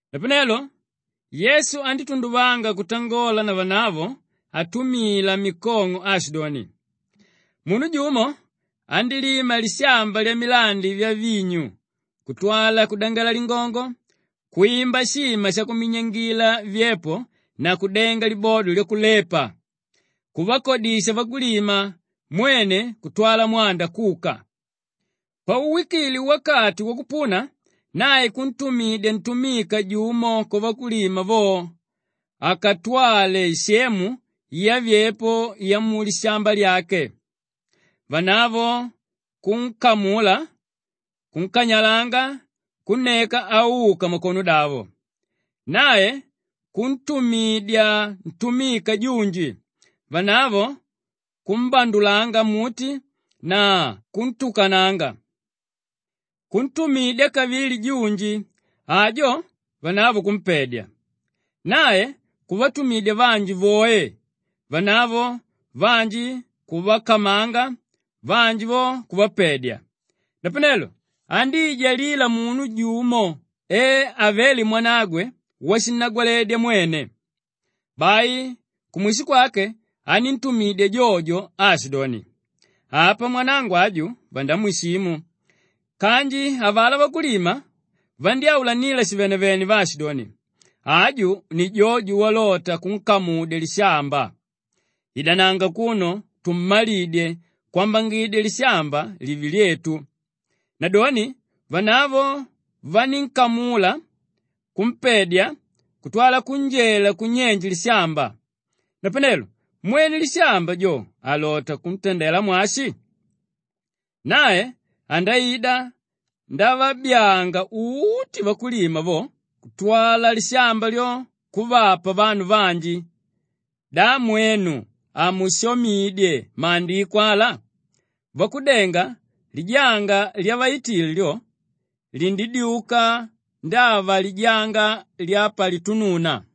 Napanelo Yesu andítunduvanga kutangola na vanavo atumila mikong'o aashidoni, “Munu jumo andílima lishamba lyamilandi vyavinyu kutwala kudangela lingongo, kwimba shima shakuminyangila vyepo na kudenga libodo lyakulepa; kuvakodisha vakulima mwene kutwala mwanda kuka. Pauwikile wakati wakupuna, nae kuntumidya ntumika jumo kwavakulima vo akatwale isemu yavyepo vyamulishamba lyake. Vanavo kunkamula, kunkanyalanga, kunneka auka makonodavo. Nae kuntumidya ntumika junji; vanavo kumbandulanga mmuti na kuntukananga. Kuntumidya kavili junji; ajo vanavo kumpedya. Nae kuvatumidya vanji voe; vanavo, vanji kuvakamanga, vanji vo kuvapedya. “Napanelo andíijalila munu jumo e avele mwanagwe washinnagwaledya mwene. Bai kumwisho kwake aníntumidya jojo jo aashidoni, ‘Apa mwanangu aju vandamwishimu!’ Kanji avalá vakulima vandyáulanila shivenevene vaashidoni, ‘Aju ni jojo walota kunkamudya lishamba. Idananga akuno tummalidye kwambangidya lishamba live lyetu.’ Nadoni vanavo vanínkamula kumpedya kutwala kunjela kunyenje lishamba. Napanelo mwene lishamba jo alota kutandela mwashi? Nae andaida ndavabyanga uti vakulima avo kutwala lishamba lyo kuvapa vanu vanji. Da mwenu hamushamidye Maandiko ala, “ ‘Vakudenga lijanga lyavaitile lyo, lindyuka ndava lijanga lyapalitununa.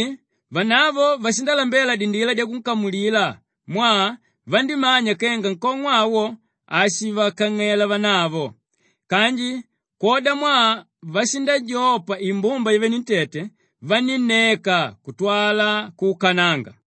Napavedoni vanavo vashindalambela dindila dyakunkamulila mwaa vandímanya kenga nkong'o awo, ashivakang'ela vanavo. Kanji kwodamwaa vashindajopa imbumba yavenentete, vanínneka kutwala kuukananga.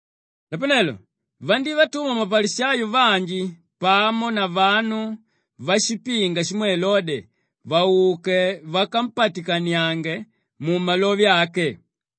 Napanelo vandívatuma mapalishayo vanji pamo na vanu vashipinga shimwe Elode vauke vakampatikaniange mumalove ake.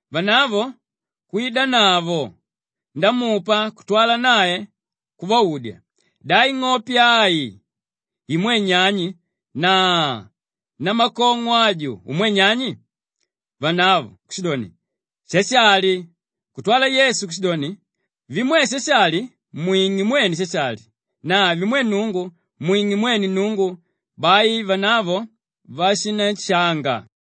Vanavo kwidanavo ndamupa kutwala nae kuvaudya, “Da ing'ope ai imwe nyani na namakong'o aju umwe nyani?” Vanavo kushidoni, “Shashali.” Kutwala Yesu kushidoni, “Vimwe Shashali, mwing'e mwene Shashali na vimwe Nnungu, mwing'e mwene Nnungu.” Bai vanavo vashinanshanga.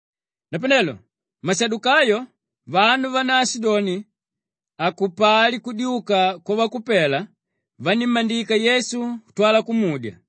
Napanelo mashadukayo, vanu vánaashidoni hakupali kudyuka kwavakupela, vanímmandika Yesu kutwala kumudya,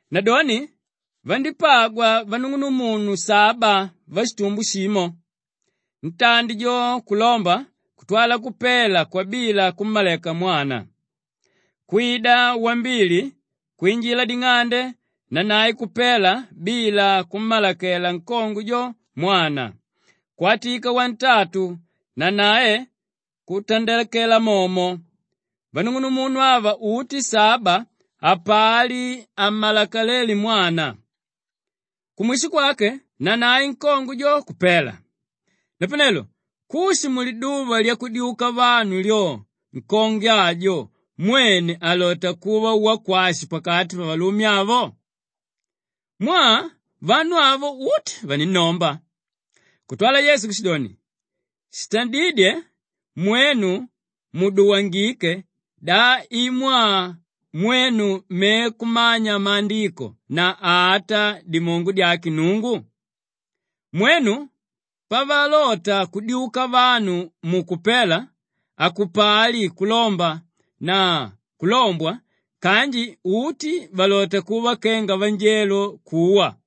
Nadoni vandípagwa vanung'unumunu saba vashitumbo shimo. Ntandi jo kulomba kutwala kupela kwabila kummaleka mwana. Kwida wambili kwinjila ding'ande nanae kupela bila kummalekela nkongwe jo mwana. Kwatika wantantu nanae kutandakela momo. Vanung'umunu ava uti saba hapali hammaleke mwana. Kumwisho kwake nanae nkongwe jo kupela. Napanelo kushi muliduva lyakudyuka vanu lyo nkongwe ajo mwene alota kuva wakwashi pakati pavalume avo? Mwaa vanu avo uti vaninnomba!” Kutwala Yesu kushidoni, “Shitadídye mwenu muduwangike da i mwaa mwenu me kumanya Maandiko na ata dimongo dyake Nnungu? Mwenu, pavalota kudyuka vanu mukupela, hakupali kulomba na kulombwa kanji uti valota kuva kenga vanjelo kuwa.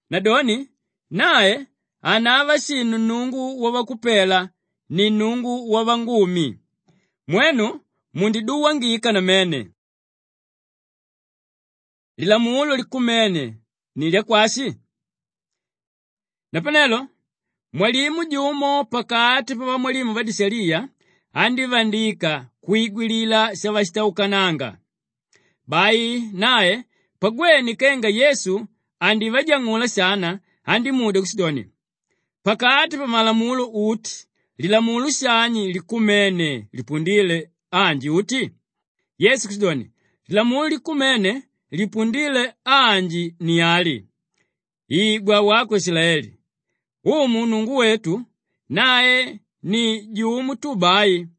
Nadoni nae hanava shinu Nnungu wavakupela, ni Nnungu wavangumi. Mwenu mundiduwangika namene!” Lilamulo likumene ni lyakwashi? Napanelo mwalimu jumo pakati pavamwalimu vadishaliya andívandika kwigwilila shavashitaukananga. Bai nae pagwene kenga Yesu andivajang'ula shana, andímudya kushidoni, “Pakati pamalamulo uti, lilamulo shani likumene lipundíle anji uti?” Yesu kushidoni, “Lilamulo likumene lipundíle anji ni ali, ‘Igwa wako Ishilaeli! Umu Nnungu wetu, nae ni jumo tu bai!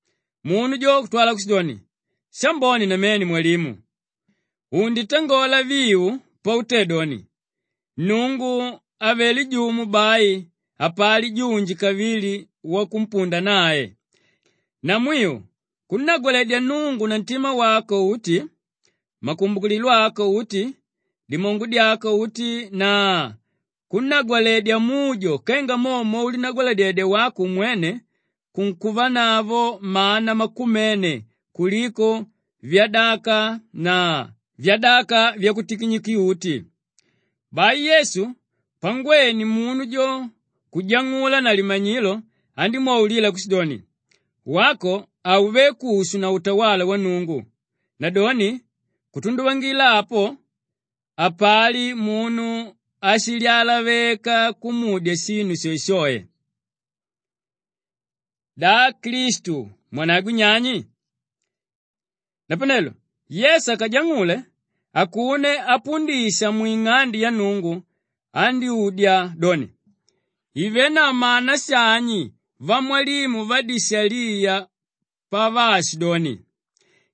Munu jo kutwala kushidoni, “Shambone namene Mwalimu! Unditangola viu pautédoni, Nnungu avelé jumo bai hapali junji kavili wakumpunda nae. Namwiu kunnagwaledya Nnungu na ntima wako uti, makumbukililo ako uti, dimongo dyako uti na kunnagwaledya mujo kenga mo mwaulinagwaladyedya wako umwene kunkuvanavo mana makumene kuliko vyadaka na vyadaka vyakutikinyuki-uti.” Bai Yesu pangwene munu jo kujang'ula na limanyilo andímwaulila kushidoni, “Wako hauvé kushu na utawala wa Nnungu.” Nadoni kutunduvangila apo hapali munu áshilyalaveka kumudya shinu shoeshoe. Da Klistu mwanagwe nyani? Napanelo Yesu akajang'ule, akuno apundisha mwing'ande ya Nnungu andyúdya doni, “Ivenavo mana shani vamwalimu vadishaliya pavaashidoni,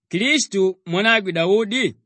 ‘Klistu, mwanagwe Daudi?’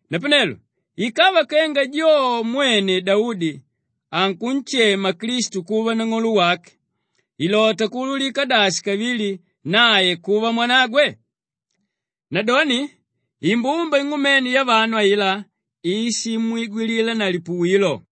Napanelo ikava kenga jo mwene Daudi ankunshema Klistu kuva Nang'olo wake, Kwali: Umu wake. ilota kuululika dashi kavili nae kuva mwanagwe?” Nadoni imbumba ing'umene yavanu ailá ishimwigwilila na lipuwilo.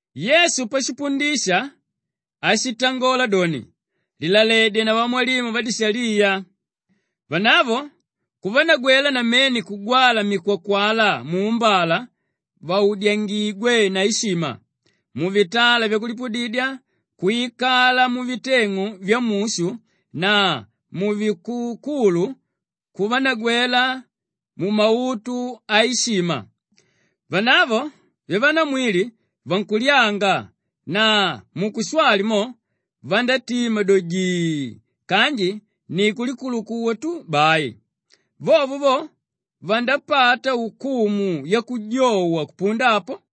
Yesu pashipundisha ashitangola doni, “Lilaledye na vamwalimu vadishaliya! Vanavo kuvanagwela namene kugwala mikwakwala muumbala vaudyangigwe na ishima, muvitala vyakulipudidya kwikala muviteng'u vyamushu na muvikukulu kuvanagwela mumautu aishima. Vanavo vyavanamwili vankulyanga na mukushwali mo, vandátima do jii kanji ni kulikulukuwa tu bai. Vovo vo vandapata ukumu yakujowa kupunda apo.”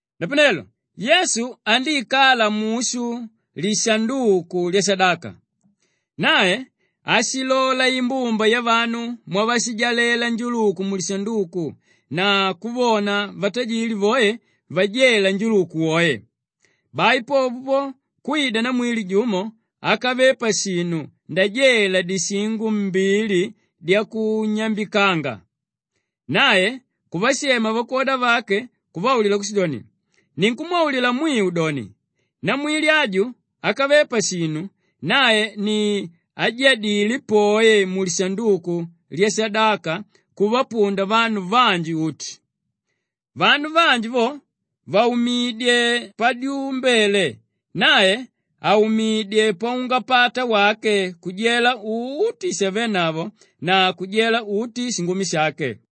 Napanelo Yesu andíikala mushu lishanduku lyashadaka. Nae ashilola imbumba yavanu mwavashijalela njuluku mulishanduku na kuvona vatajili voe vajela njuluku woe. Bai popo po, kwida namwili jumo ákave pashinu ndajela dishingo mbili dyakunyambikanga. Nae kuvashema vakwoda vake kuvaulila kushidoni, “Ninkumwaulila mwiu doni, namwili aju ákave pashinu, nae ni ájadile poe mulishanduku lyashadaka kuvapunda vanu vanji uti. Vanu vanji vo vaumidyé padyumbele, nae aumidyé paungapata wake kujela uti shavenavo na kujela uti shingumi shake.”